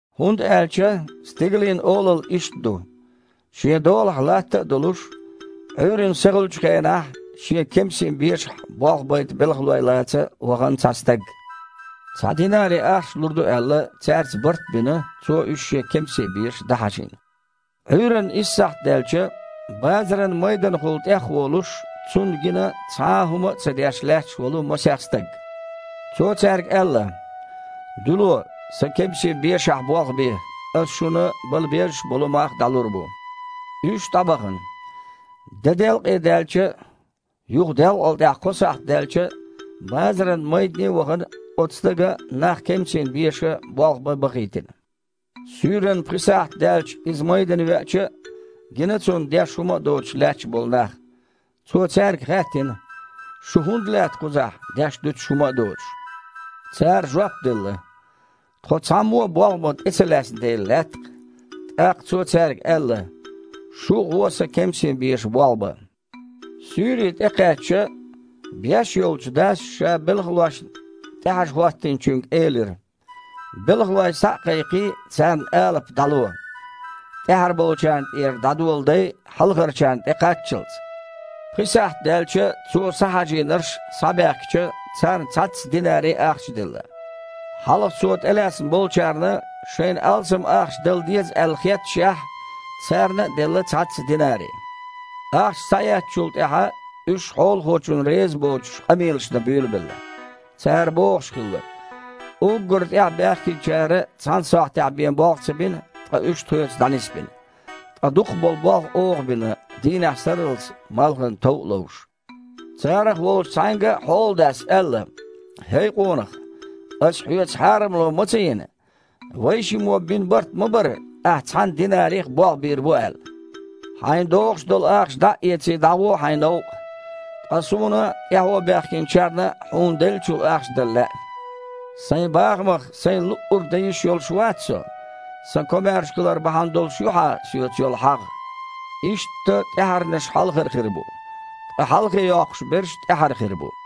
«ХІунда аьлча Стигалийн Олалла иштта ду. Шен долахь латта а долуш, Іуьйранна сахуьлучу хенахь шен кемсийн бешахь болх байта белхалой лаца вахана цхьа стаг. Цхьа динари ахча лур ду аьлла, цаьрца барт а бина, цо уьш шен кемсийн беша дІахьажийна. Іуьйранна исс сахьт даьлча, базаран майданахула тІехволуш, цунна гина цхьа а хІума а ца деш лаьтташ волу масех стаг. Цо цаьрга аьлла: „Дуьйло, сан кемсийн бешахь болх бе, аса шуна бала беззаш болу мах дІалур бу“. Уьш дІабахана. Де делкъе даьлча а, юха делкъал тІаьхьа кхо сахьт даьлча а, базаран майдане а вахана, оцу стага нах кемсийн беша болх бан бахийтина. Суьйранна пхи сахьт даьлча иза майдана веача а, гина цунна деш хІума а доцуш лаьтташ болу нах. Цо цаьрга хаьттина: „Шу хІунда лаьтта кхузахь, деш-дуьтуш хІума а доцуш?“ Цара жоп делла: „Тхо цхьаммо а болх бан тІе ца лаьцна дела лаьтта-кх“. ТІаккха цо цаьрга аьлла: „Шу а гІо сан кемсийн беша болх бан“. Суьйре тІекхаьчча, беш йолчу дас ша белхалошна тІехьажа хІоттийначуьнга элира: „Белхалой схьа а кхайкхий, царна алапа дІало – тІаьхьара болчарна тІера дІадоладай, хьалхарчарна тІекхаччалц“. Пхи сахьт даьлча цо схьахьажийнарш схьабаьхкича, царна цхьацца динари ахча делла. Хьалха цо тІелаьцна болчарна, шайна алсам ахча дала деза аьлла хетташехь, царна а делла цхьацца динари. Ахча схьаэцначул тІаьхьа уьш, хьолахочунна резабоцуш, къамелаш дан буьйлабелла. Цара бохуш хилла: „Уггар тІаьхьа баьхкинчара цхьана сахьтехь бен болх ца бина, ткъа уьш тхоьца дІанисбина. Ткъа дукхах болу болх оха бина, дийнахь сарралц малхан тов а ловш“. Царах волчу цхьаьнга хьоладас аьлла: „ХІей къонах, аса хьоьца хьарамло ма ца йина. Вайшиммо бина барт ма бара, ахьа цхьана динарих болх бийр бу аьлла. Хьайна догІуш долу ахча дІа а эций, дІагІо хьайн новкъа. Ткъа суна тІаьхьо баьхкинчарна а хьуна деллачул ахча дала лаьа. Сайн бахамах сайна луъург дан йиш йолуш вац со? Сан комаьрша хилар бахьана долуш ю хьан соьца йолу хьагІ?“ Иштта тІаьхьарнаш хьалхара хир бу, ткъа хьалхе йоккхуш берш тІаьхьара хир бу».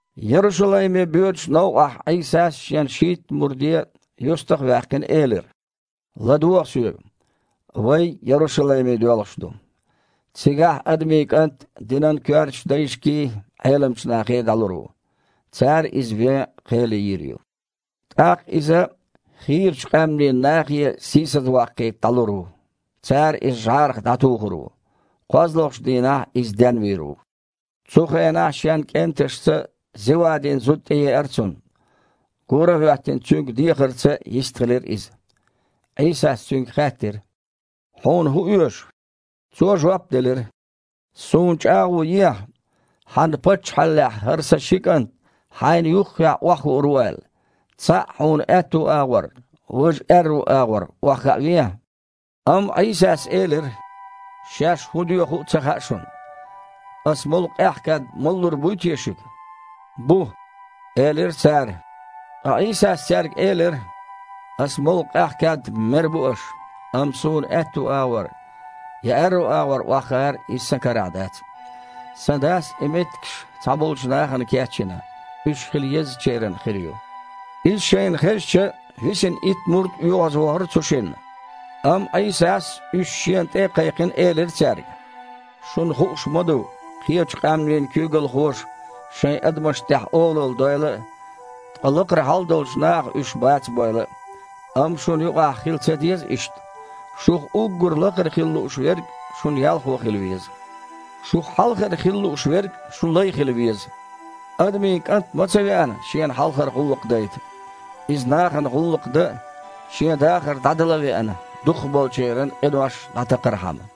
Ярушалайме боьдучу новкъахь Іийсас Шен шийтта мурде, юьстаха а ваьккхина, элира: «ЛадогІа Соьга. Вай Ярушалайме доьлхуш ду. Цигахь Адамийн КІант динан коьртачу дайшкий, Іеламчу нахей дІалур ву. Цара Иза вен кхел йийр ю. ТІаккха Иза хийрачу къаьмнийн нахе сийсазваккхийта дІалур ву. Цара Иза жІарах дІатухур ву. КхозлагІчу дийнахь Иза денвийр ву». Цу хенахь шен кІенташца Зевадин зуда тІееара Цунна. Гора а хІоьттина, Цуьнга дехарца йистхилира иза. Іийсас цуьнга хаьттира: «Хьуна хІун оьшу?» Цо жоп делира: «Суна чІагІо ехьа, Хьан Паччахьаллехь хІара сан ши кІант Хьайна юххехь охьахуур ву аьлла. Цхьаъ Хьуна аьтту агІор, важа аьрру агІор охьахаавехьа». Амма Іийсас элира: «Шаьш хІун доьху а ца хаьа шуна. Аса молу къаьхьа кад малалур буй те шуьга?» «Бу», – элира цара. Ткъа Іийсас цаьрга элира: «Аса молу къаьхьа кад-м мер бу аша. Амма Суна аьтту агІор, я аьрру агІор охьахаар – иза Сан карахь дац. Сан Дас и меттигаш цхьаболчу нахана кечйина, уьш хила еззачеран хир ю». Иза шайна хезча, висина итт мурд оьгІазвахара цу шинна. Амма Іийсас, уьш Шена тІе а кхайкхина, элира цаьрга: «Шуна хууш ма ду, кхечу къаьмнийн куьйгалхоша шайн адамашна тІехь олалла дойла а, ткъа лакхара хьалдолчу наха уьш бацабойла а. Амма шуна юкъахь хила ца деза иштта. Шух уггар лакхара хила лууш верг шун ялхо хила веза. Шух хьалхара хила лууш верг шун лай хила веза. Адамийн КІант а ма ца веана Шена хьалхара гІуллакх дайта. Иза нахана гІуллакх дан а, Шен дахар дІадала а веана, дукхахболчеран къинош дІатакхархьама».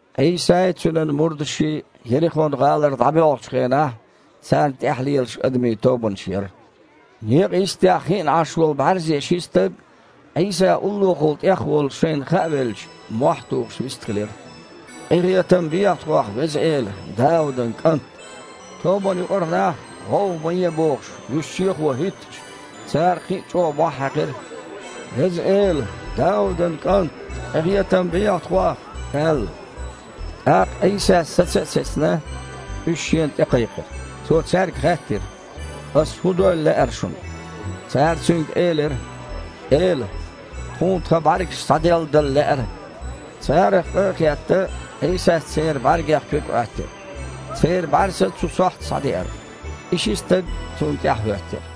Іийсай, Цуьнан мурдашший Ерихон-гІалара дІабоьлхучу хенахь, царна тІаьхьа лелаш адамийн тобанаш яра. Некъа йистехь хиъна Іаш волу бІаьрзе ши стаг, Іийса уллохула тІехволуш шайна хаавелча, мохь а тухуш, вистхилира: «Къинхетам бехьа тхох, Веза Эла, Даудан КІант!» Тобанна юкъара нах, гІовгІа ма е а бохуш, вуьш чехо хІоьттича, цара кхин а чІогІа мохь хьаькхира: «Веза Эла! Даудан КІант! Къинхетам бехьа тхох!» – аьлла. ТІаккха Іийсас, саца а сецна, уьш Шена тІекхайкхира. Цо цаьрга хаьттира: «Аса хІун дойла лаьара шуна?» Цара Цуьнга элира: «Эла! Тхуна тхан бІаьргаш схьаделладала лаьара». Царах къа а хетта, Іийсас церан бІаьргех куьг Іоьттира. Церан бІаьрса цу сохьта схьадеара. И ши стаг Цунна тІаьхьахІоьттира.